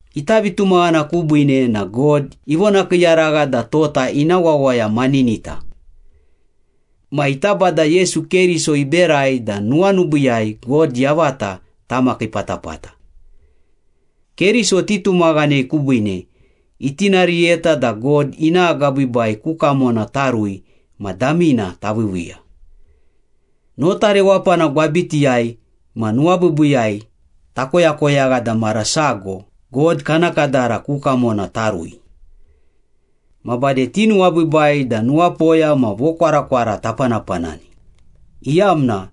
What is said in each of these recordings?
Ita vitumaghana kubiine na God ivonakiiyaragha da tota ina wawaya maninita. Ma ita Bada Yesu Keriso iberai da nuwanubiiyai God yavata tamakii patapata. Keriso titumaghanei kubiine itinariyeta da God ina agabiibai ku kamona tarui ma damina taviiviiya. Nota rewapana gwabitiyai ma nuwabiibiiyai takoyakoyagha da mara sago God kana kadara ku kamona tarui. Ma bade tinuwabiibai da nuwapoya ma vokwarakwara tapanapanani, iyamna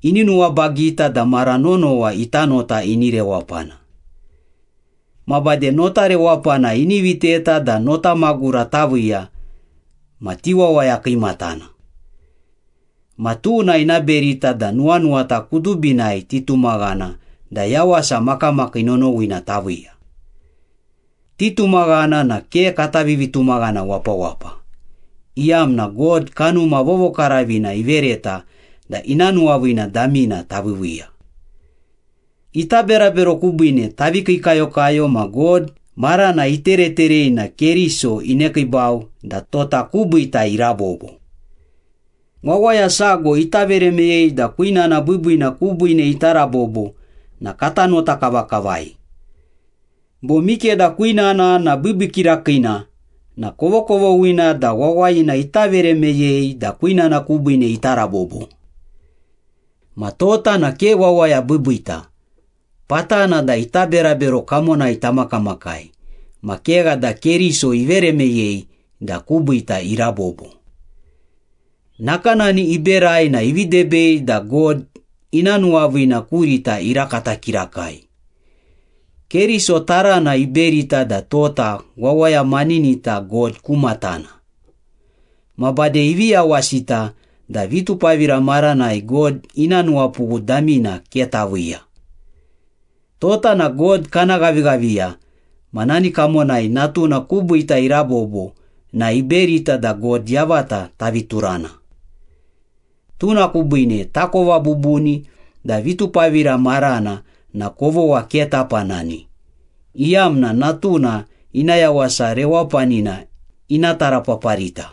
ini nuwabagita da mara nonowa ita nota ini rewapana. Ma bade notarewapana ini viteta da notamagura taviiya ma tiwawaya kiimatana. Ma tuna ina berita da nuwanuwata kudubinai titumaghana da yawasa makamakii nonowina taviiya. Titumaghana na ke kata vivitumaghana wapawapa, iyamna God Kanuma Vovokaravina ivereta da ina nuwaviina damina taviiviiya. Ita berabero kubiine tavi kiikayokayo ma God marana itereterei na Keriso inekiibau da tota kubiita irabobo. Wawaya sago ita vere meyei da kwinana biibiina kubiine ita rabobo na kata nota kavakavai. Bo mikeda kwinana na biibii kirakiina na kovokovoghina da wawayina ita vere meyei da kwinana kubiine ita rabobo. Ma tota na ke wawaya biibiita, patana da ita berabero kamonai tamakamakai ma kegha da Keriso ivere meyei da kubiita irabobo. Nakanani iberai na ivi debei da God ina nuwaviina kurita irakata kirakai. Keriso tarana iberita da tota wawaya maninita God ku matana. Ma bade ivi yawasita da vitupavira maranai God ina nuwapughu damina ke taviiya. Tota na God kana ghavighaviya ma nani kamonai Natuna kubiita irabobo na iberita da God yavata tavi turana. Tuna kubiine takova bubuni da vitupavira marana na kovogha ke tapanani, iyamna Natuna ina yawasa rewapanina ina tarapaparita.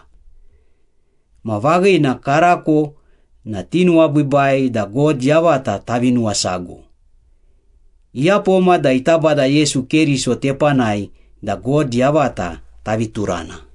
Ma vaghina, karako na tinuwabiibai da God yavata tavi nuwasago. Iyapoma da ita Bada Yesu Keriso tepanai da God yavata tavi turana.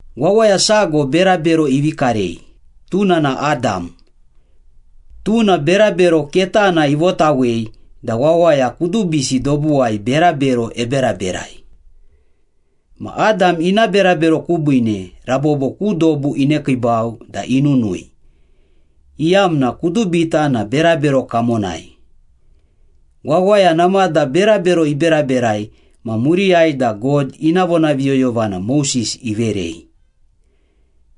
Wawaya sago berabero ivi karei, tuna na Adam. Tuna berabero ketana ivotawei da wawaya kudubisi dobuwai berabero eberaberai. Ma Adam ina berabero kubiine rabobo ku dobu inekiibau da inunui, iyamna kudubita na berabero kamonai. Wawaya namada berabero iberaberai ma muriyai da God ina vonaviyoyovana Moses iverei.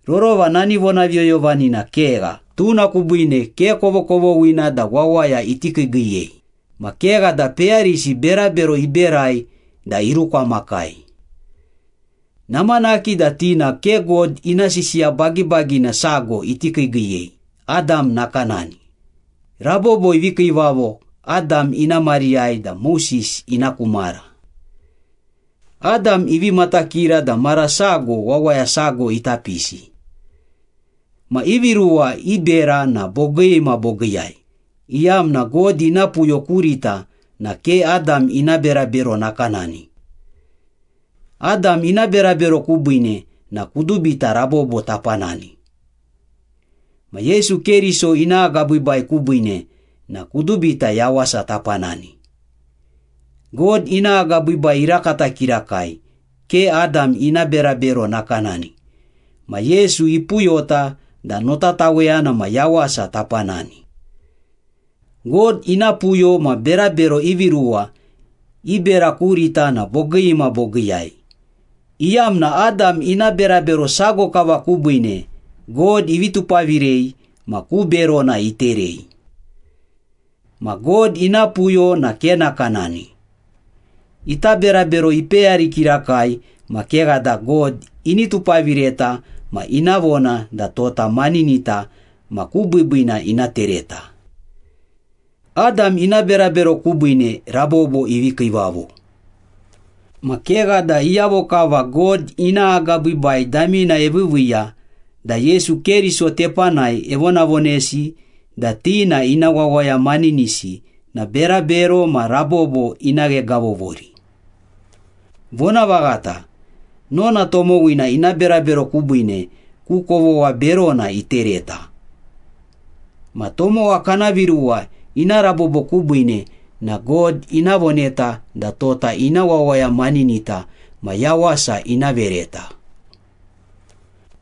Rorova na nani vonaviyoyovanina kegha, tuna kubiine ke kovokovoghina da wawaya iti kiigiiyei, ma kegha da peyarisi berabero iberai da irukwamakai. Namanaki da ti na ke God ina sisiya bagibagina sago iti kiigiiyei Adam nakanani, rabobo ivi kiivavo Adam ina mariyai da Moses ina ku mara. Adam ivi matakira da mara sago wawaya sago ita pisi. Ma ivi ruwa i bera na bogii ma bogiiyai, iyamna God ina puyo kurita na ke Adam ina berabero nakanani. Adam ina berabero kubiine na kudubita rabobo tapanani. Ma Yesu Keriso ina agabiibai kubiine na kudubita yawasa tapanani. God ina agabiibai irakata kirakai, ke Adam ina berabero nakanani ma Yesu ipuyota da notataweyana ma yawasa tapanani. God ina puyo ma berabero ivi ruwa i bera kurita na bogii ma bogiiyai, iyamna Adam ina berabero sago kava kubiine God ivi tupavirei ma ku berona iterei. Ma God ina puyo na ke nakanani. Ita berabero ipeyari kirakai ma kegha da God ini tupavireta ma ina vona da tota maninita ma ku biibiina ina tereta. Adam ina berabero kubiine rabobo ivi kiivavo. Ma kegha da iyavo kava God ina agabiibai damina eviiviiya da Yesu Keriso tepanai evonavonesi da ti na ina wawaya maninisi na berabero ma rabobo ina ghegavovori. Vonavaghata, nona tomowina ina berabero kubiine ku kovogha berona itereta. Ma tomowa kana viruwa ina rabobo kubiine na God ina voneta da tota ina wawaya maninita ma yawasa ina vereta.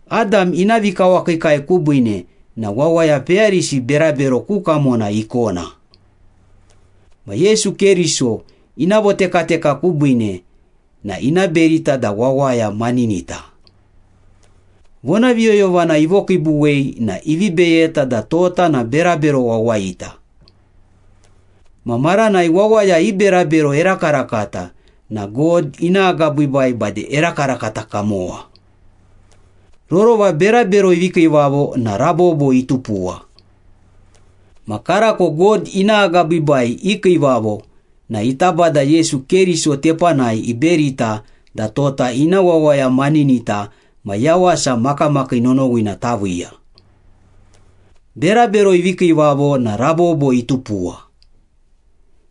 Adam ina vikawakiikai kubiine na wawaya peyarisi berabero ku kamona ikona. Ma Yesu Keriso ina votekateka kubiine na ina berita da wawaya maninita. Vonaviyoyovana ivokiibuwei na ivi beyeta da tota na berabero wawayita. Ma maranai wawaya i berabero erakarakata na God ina agabiibai bade erakarakata kamowa. Rorova berabero ivi kiivavo na rabobo itupuwa. Ma karako God ina agabiibai ikiivavo na ita Bada Yesu Keriso tepanai iberita da tota ina wawaya maninita ma yawasa makamakii nonowina taviiya. Berabero ivi kiivavo na rabobo itupuwa.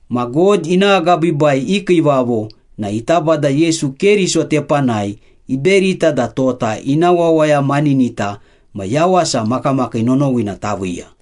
Ma God ina agabiibai ikiivavo na ita Bada Yesu Keriso tepanai iberita da tota ina wawaya maninita ma yawasa makamakii nonowina taviiya.